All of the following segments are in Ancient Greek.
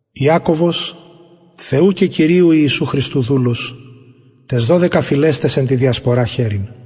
ιακωβος θεου και κυριου ιησου χριστου δουλος ταις δωδεκα φυλαις ταις εν τη διασπορα χαιρειν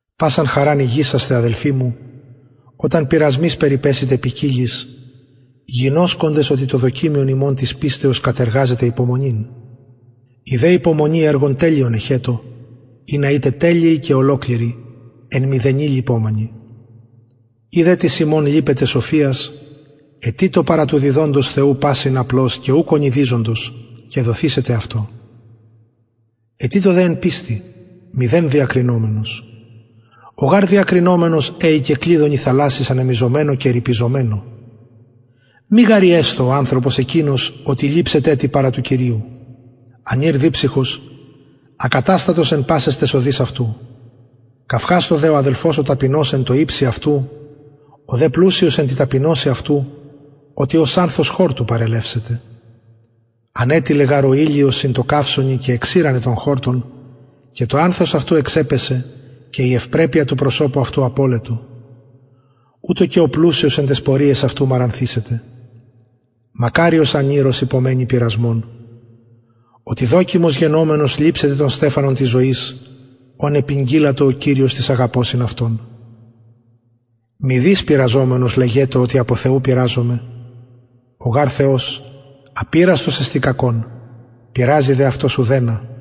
πασαν χαραν ηγησασθε αδελφοι μου οταν πειρασμοις περιπεσητε ποικιλοις γινωσκοντες οτι το δοκιμιον υμων της πιστεως κατεργαζεται υπομονην η δε υπομονη εργον τελειον εχετω ινα ητε τελειοι και ολοκληροι εν μηδενι λειπομενοι ει δε τις υμων λειπεται σοφιας αιτειτω παρα του διδοντος θεου πασιν απλως και ουκ ονειδιζοντος και δοθησεται αυτω αιτειτω δε εν πιστει μηδεν διακρινομενος ο γαρ διακρινομενος εοικεν κλυδωνι θαλασσης ανεμιζομενω και ριπιζομενω μη γαρ οιεσθω ο ανθρωπος εκεινος οτι ληψεται τι παρα του κυριου ανηρ διψυχος ακαταστατος εν πασαις ταις οδοις αυτου καυχασθω δε ο αδελφος ο ταπεινος εν τω υψει αυτου ο δε πλουσιος εν τη ταπεινωσει αυτου οτι ως ανθος χορτου παρελευσεται ανετειλεν γαρ ο ηλιος συν τω καυσωνι και εξηρανεν τον χορτον και το ανθος αυτου εξεπεσεν και η ευπρεπεια του προσωπου αυτου απωλετο ουτως και ο πλουσιος εν ταις πορειαις αυτου μαρανθησεται μακαριος ανηρ ος υπομενει πειρασμον οτι δοκιμος γενομενος ληψεται τον στεφανον της ζωης ον επηγγειλατο ο κυριος τοις αγαπωσιν αυτον μηδεις πειραζομενος λεγετω οτι απο θεου πειραζομαι ο γαρ θεος απειραστος εστιν κακων πειραζει δε αυτος ουδενα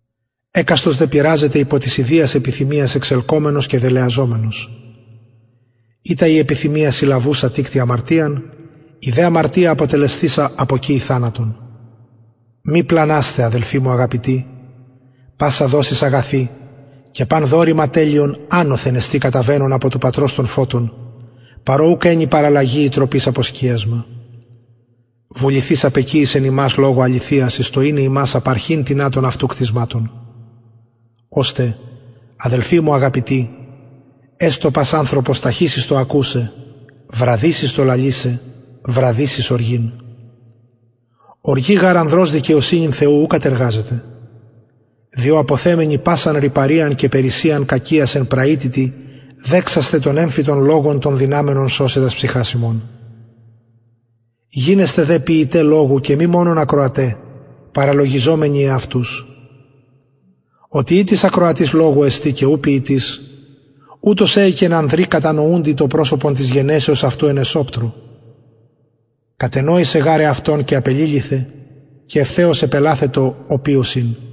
εκαστος δε πειραζεται υπο της ιδιας επιθυμιας εξελκομενος και δελεαζομενος ειτα η επιθυμια συλλαβουσα τικτει αμαρτιαν η δε αμαρτια αποτελεσθεισα αποκυει θανατον μη πλανασθε αδελφοι μου αγαπητοι πασα δοσις αγαθη και παν δωρημα τελειον ανωθεν εστιν καταβαινον απο του πατρος των φωτων παρ ω ουκ ενι παραλλαγη η τροπης αποσκιασμα βουληθεις απεκυησεν ημας λογω αληθειας εις το ειναι ημας απαρχην τινα των αυτου κτισματων ωστε αδελφοι μου αγαπητοι εστω πας ανθρωπος ταχυς εις το ακουσαι βραδυς εις το λαλησαι βραδυς εις οργην οργη γαρ ανδρος δικαιοσυνην θεου ου κατεργαζεται διο αποθεμενοι πασαν ρυπαριαν και περισσειαν κακιας εν πραυτητι δεξασθε τον εμφυτον λογον τον δυναμενον σωσαι τας ψυχας υμων γινεσθε δε ποιηται λογου και μη μονον ακροαται παραλογιζομενοι εαυτους οτι ει τις ακροατης λογου εστιν και ου ποιητης ουτος εοικεν ανδρι κατανοουντι το προσωπον της γενεσεως αυτου εν εσοπτρω κατενοησεν γαρ εαυτον και απεληλυθεν και ευθεως επελαθετο οποιος ην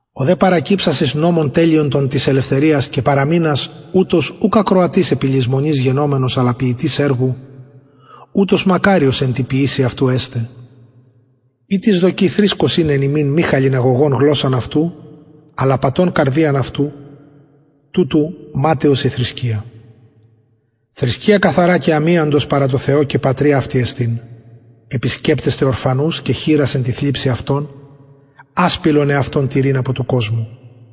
ο δε παρακυψας εις νομον τελειον τον της ελευθεριας και παραμεινας ουτος ουκ ακροατης επιλησμονης γενομενος αλλα ποιητης εργου ουτος μακαριος εν τη ποιησει αυτου εσται ει τις δοκει θρησκος ειναι εν υμιν μη χαλιναγωγων γλωσσαν αυτου αλλα απατων καρδιαν αυτου τουτου ματαιος η θρησκεια θρησκεια καθαρα και αμιαντος παρα θεω και πατρι αυτη εστιν επισκεπτεσθαι ορφανους και χηρας εν τη θλιψει αυτων ασπιλον εαυτον τηρειν απο του κοσμου